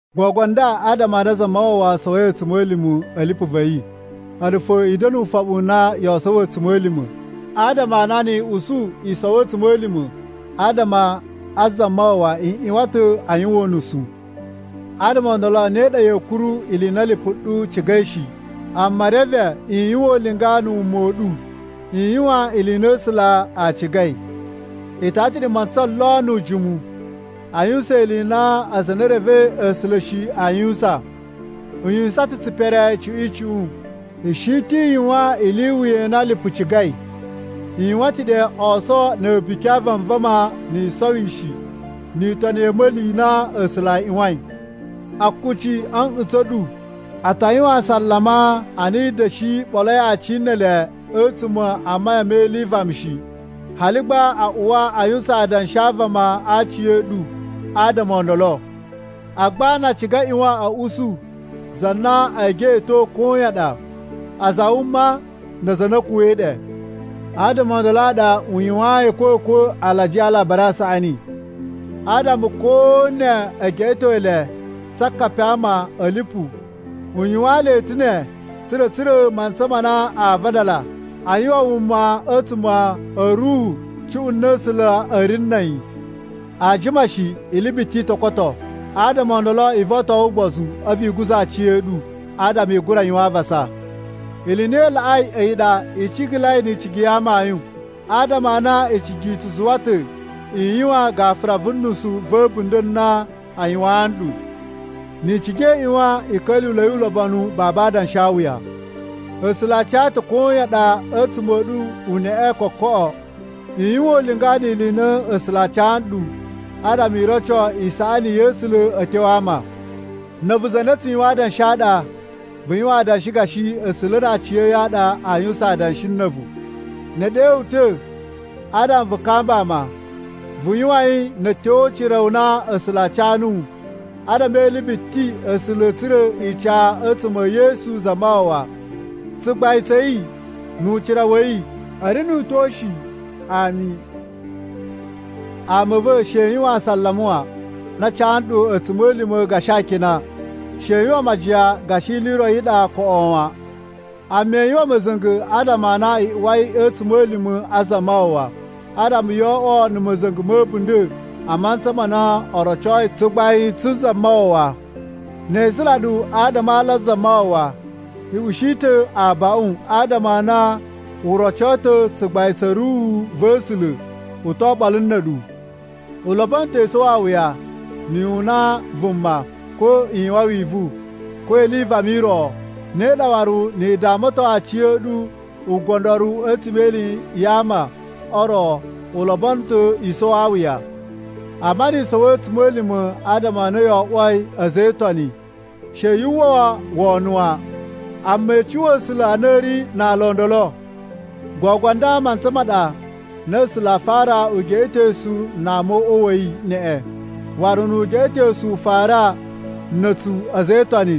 Gogo nda, adama a na Zamawawa sowoi a̱tsuma̱lima̱ a̱ lipu va̱ yi, a̱ɗu fo i da̱na̱ ufoɓu u na yoo sowo a̱tsuma̱lima̱. Adama a na ni i usu i sowo a̱tsuma̱lima̱ adama a Zamawawa i ꞌyuwan ta̱ a yuwan unusu. Adama o ndolo ne ɗa ya̱a̱ kuru ili i na lipu ɗu cigai shi, amma reve i yuwan ulinga na̱ wuma u ɗu i yuwan ili i na A̱sula̱ a cigai. I tara ta̱ ɗe mantsa lon nu ujimu a yuwusan ili i na aza a na e revei A̱sula̱ shi aa yuwusan. I yuwusan ta̱ tsipere icuꞌun icuꞌun, i shi ta̱ i yuwan ili i wuya i na lipu cigai, i yuwan ta̱ ɗe oso na̱ a̱buki a vanvama na̱ yisowishi ni itoni ya̱ a̱ma̱li i na A̱sula̱ a ꞌyuwain. Akuci a̱ nꞌutsa̱ n ɗu a ta yuwan asalama a na i da̱shi ɓoloi aci ne ele a̱tsuma̱ a mayan me ili i vama shi. Hali gba a uwa a yuwusan adanshi a vama a aci a̱ ɗu adama o ndolo. Agba na a ciga a ꞌyuwan a̱ usu za na ee geꞌeto koyan ɗa, aza a wuma na aza a na a̱ kuwa̱i ɗe. Adama o ndolo a ɗa u yuwayin a̱kwa̱kwa̱ alajiya a Alabari a Saꞌani. Adama ko ne e geꞌeto le tsa akapi a ama a̱ lipu, u yuwaan le ta̱ ne tsa̱ra̱ a̱ tsura̱ mantsa ma na a vadala a yuwan wuma a̱tsuma̱ a̱ ruhu cuꞌun na A̱sula̱ a̱ ri na̱ a̱yi. Aa jima shi ili biti i to koto. Adama o ndolo i voton ugbozu a̱vu i guza̱ aciya̱ɗu adama i gura yuwan avasa. Ili i na i laꞌai a̱yi ɗa, i cigalai ni icigi ya amayun, adama a na icigi i tsu zuwa ta̱ i yuwan gafura vu nusu va̱ a̱bunda̱ a na a yuwaan nɗu. Ni i ciga i ꞌyuwan i ka̱lyuwula̱i ulobonu babu adanshawuya. A̱sula̱ a ca ta̱ koyan ɗa a̱tsuma̱ a̱ ɗu uneꞌe kokoꞌo. I yuwan ulinga ni ili i na A̱sula̱ a ca nɗu adama i roco isaꞌani ya̱ A̱sula̱ a̱ tyo a ama. Na̱ a̱vu za na tsu yuwan adanshi a ɗa, vu yuwan adanshi gashi A̱sula̱ na aciya̱yi a ɗa aa yuwusan adanshi na̱ a̱vu. Ne e ɗe wu ta̱ adama vu kamba ama, vu yuwan yi na̱ a̱tyo o ucira u na A̱sula̱ a ca nuwu. Adama e ili biti A̱sula̱ a̱ tsura̱ ica a̱tsuma̱ e Yesu Zamawawa. Tsugbain tsa̱ yi nu ucira wa̱ yi a̱ ri nu utyo shi. Ami. Ama a̱ va̱, she i yuwan asalama wan na a ca ɗu a̱tsuma̱lima̱ gashi akina. She i yuwan majiyan gashi ili i ro i ɗa koꞌo wan. Amma i yuwan ma̱za̱nga̱ adama a na i uwai a̱ a̱tsuma̱lima̱ a Zamawawa. Adama yo oꞌwo na̱ ma̱za̱nga̱ ma̱ a̱bunda̱ a mantsa ma na o rocoi tsugbain tsu Zamawawa. Ne e isula ɗu adama a ala a Zamawawa, i ushi ta̱ abaꞌun, adama a na u roco ta̱ tsugbain tsa̱ Ruhu va̱ A̱sula̱ u to oɓolo na̱ a̱ɗu. U lobono ta̱ i sowo awuya na̱ yu una vuma, ko i yuwan wivu, ko ili i vama i ro. Ne ɗa waru ni i damaton aciya̱ɗu ugondoru a̱tsuma̱ e ili ya ama o ro, u lobono ta̱ i sowo awuya. Amma ni i sowo a̱tsuma̱lima̱ adama a na yo oꞌwoi a̱za̱ e Itoni, she yu uwwa wono wan. Amma i cuwa A̱sula̱ a na i ri na ala o ndolo. Gogo nda mantsa ma ɗa a na A̱sula̱ aa fara ugeꞌetosu na ama o uꞌwa wa̱ yi neꞌen. Waru nu ugeꞌetosu u fara na̱ a̱tsu a̱za̱ e Itoni,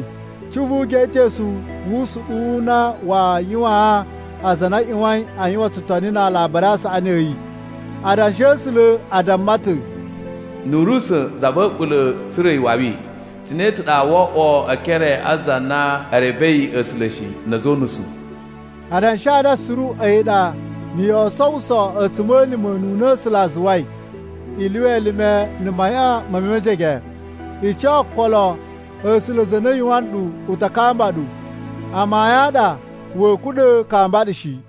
cuꞌun vu ugeꞌetosu wu usuɗuwu u na waa yuwaan aza a na a ꞌyuwain a yuwan tsutoni na Alabari a Saꞌani a̱ yi? Adanshi a̱ A̱sula̱ a damma ta̱, “Nu u ri usa̱n za va̱ a̱ɓula̱ tsura̱ iwawi, cine tsa ɗa woo oꞌwo e ekere a aza a na e revei A̱sula̱ shi, na̱ a̱za̱ o unusu?” Adanshi a nda suru a̱yi ɗa na̱ yoo sowuso a̱tsuma̱lima̱ ununa A̱sula̱ a zuwai, i lyuwa elime na̱ mayan me mejege, i ca okolo, A̱sula̱ za na yuwan nɗu u ta kamba ɗu. Amayun a ɗa wa̱a̱ kuɗa̱ a kamba ɗu shi.